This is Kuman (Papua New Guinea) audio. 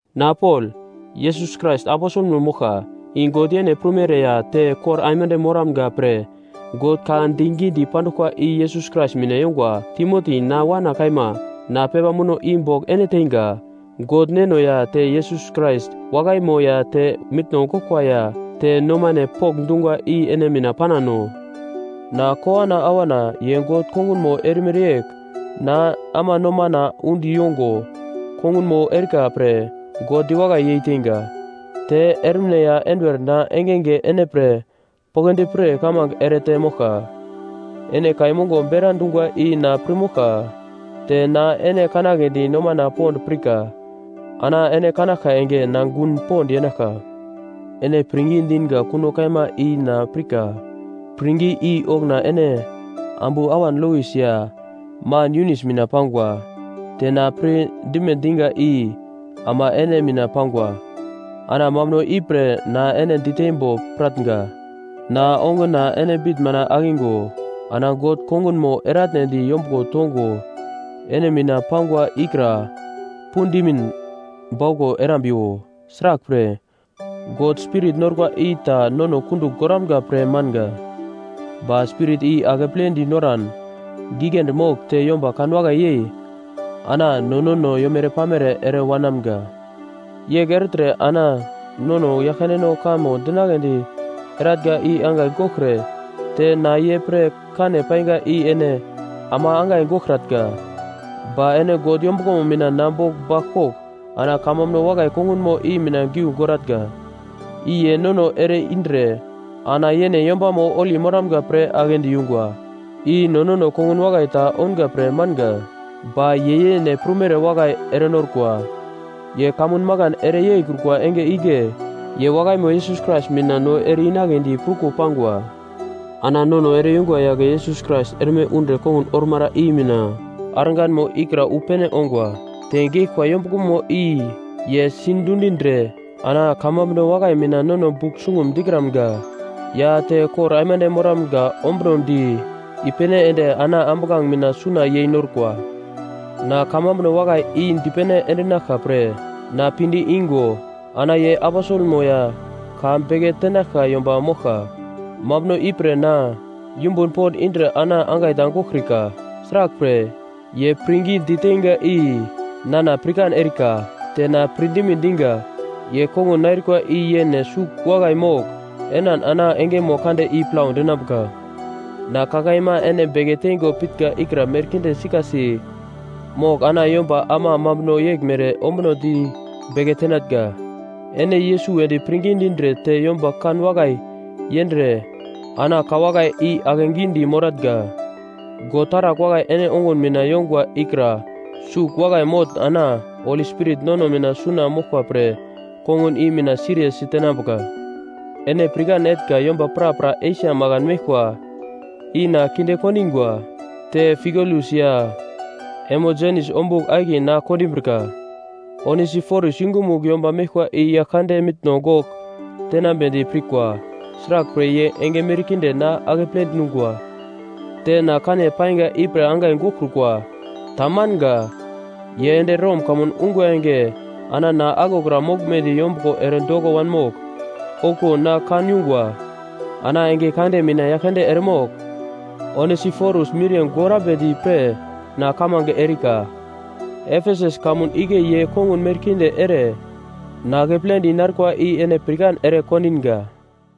Na Pol, Yesus Krais aposelmo moglka, i God yene prumere, ya te kor aimande moramga pre God ka digi dipanduglkwa i Yesus Krais mina yongwa, Timoti, na wana kaima, na pepa muno i bogl ene teinga, God Neno ya te Yesus Krais wakaimo ya te mitno goglkwa ya te nomane pokndungwa i ene mina panano. Na kowana awana ye God kongunmo erimere yegl na ama nomana undi yongo kongunmo erika pre God diwakai yeiteinga. Te ermine ya enduwer na engenge ene pre poglodi pir kamange erete moglka. Ene kai mongo bera dungwa i na pir moglka, te na ene kanagledi nomana pond pirka. Ana ene kanaglka enge na gun pond yenaglka. Ene pirngi dinga kuno kaima i na pirka. Pirngi i okuna ene ambu awan Lois ya man Yunis mina pangwa, te na pir dime diga i ama ene mina pangwa. Ana mambuno ipre na ene diteimbo piratnga. Na onguna ene bitn mina akigo ana God kongunmo eratnedi yombuglo tongo ene mina pangwa ikra pudimin bauglo erambiwo. Sraglpre, God spirit norkwa i ta nono kundugl goramga pre manga; ba spirit i akeple dinoran giglendi mogl te yomba kanwakai yei ana no nono yomere-pamere ere wanamga. Yegl ertre ana nono Yaglkandeno kamo dinagledi eratnga i angai goglkre te na ye pre kane painga i ene ama angai goglkratnga. Ba ene God yombuglomo mina na bogl baglkogl ana kamambuno wakai kongunomo i mina giu goratnga. I ye nono ere-indre ana yene yombamo holi moramga pre agle diyungwa, i no nono kongun wakai ta ounga pre manga, ba ye yene prumere wakai erenorkwa. Ye kamun makan ere yeikrukwa enge igle ye wakaimo Yesus Krais mina no ere-inagledi pruko pangwa. Ana nono ere-yungwa yagle Yesus Krais erme undre kongun ormara i mina arganmo ikra wu pene ongwa. Te geglkwa yombuglomo i ye sidundindre, ana kamambuno wakai mina nono bugl sungum dikramga ya te kor aimande moramga ombunodi i-pene ende ana ambuglange mina suna yei norkwa. Na kamambuno wakai i dipene endinaglka pre na pinde igo ana ye aposelmo ya ka beke tenaglka yomba moglka. Mambuno ipre na yumbun pond indre ana angai ta goglkrika. Sraglpre, ye pirngi diteinga i nana pirkan erika, te na pirdime diga, ye kongun narikwa i yene sugl wakai mogl enan ana engemo kande i plau dinambuka. Na ka kaima ene beke teingo pitnga ikra merkinde sikasi mogl ana yomba ama mambuno yeglmere ombunodi beke tenatnga. Ene Yesus wedi pirngi dindre te yomba kan wakai yendre ana ka wakai i ake gidi moratnga. God taragl wakai ene ongun mina yongwa ikra sugl wakai motn ana Holi Spirit nono mina suna moglkwa pre, kongun i mina siriye sitenambuka. Ene pirkan etnga yomba prapra Esia makan meglkwa i na kinde kondingwa, te Figelus ya Hermogenes ombugl akiye na kondimbrika. Onesiforus yungumugl yomba meglkwa i Yaglkande mitno gogl tenambedi pirka. Sraglpre ye enge merkinde na akeple dungwa, te na kane painga ipre angai goglkrukwa. Tamanga. Ye ende Rom kamun ungwa enge ana na aglokra moglmedi yombuglo ere doko wanmogl, okuwo na kan yungwa. Ana enge kande mina Yaglkande eremogl Onesiforus miriye gorambedi pre na kamange erika! Efesus kamun igle ye kongun merkinde ere na akepledi narikwa i ene pirkan ere kondinga.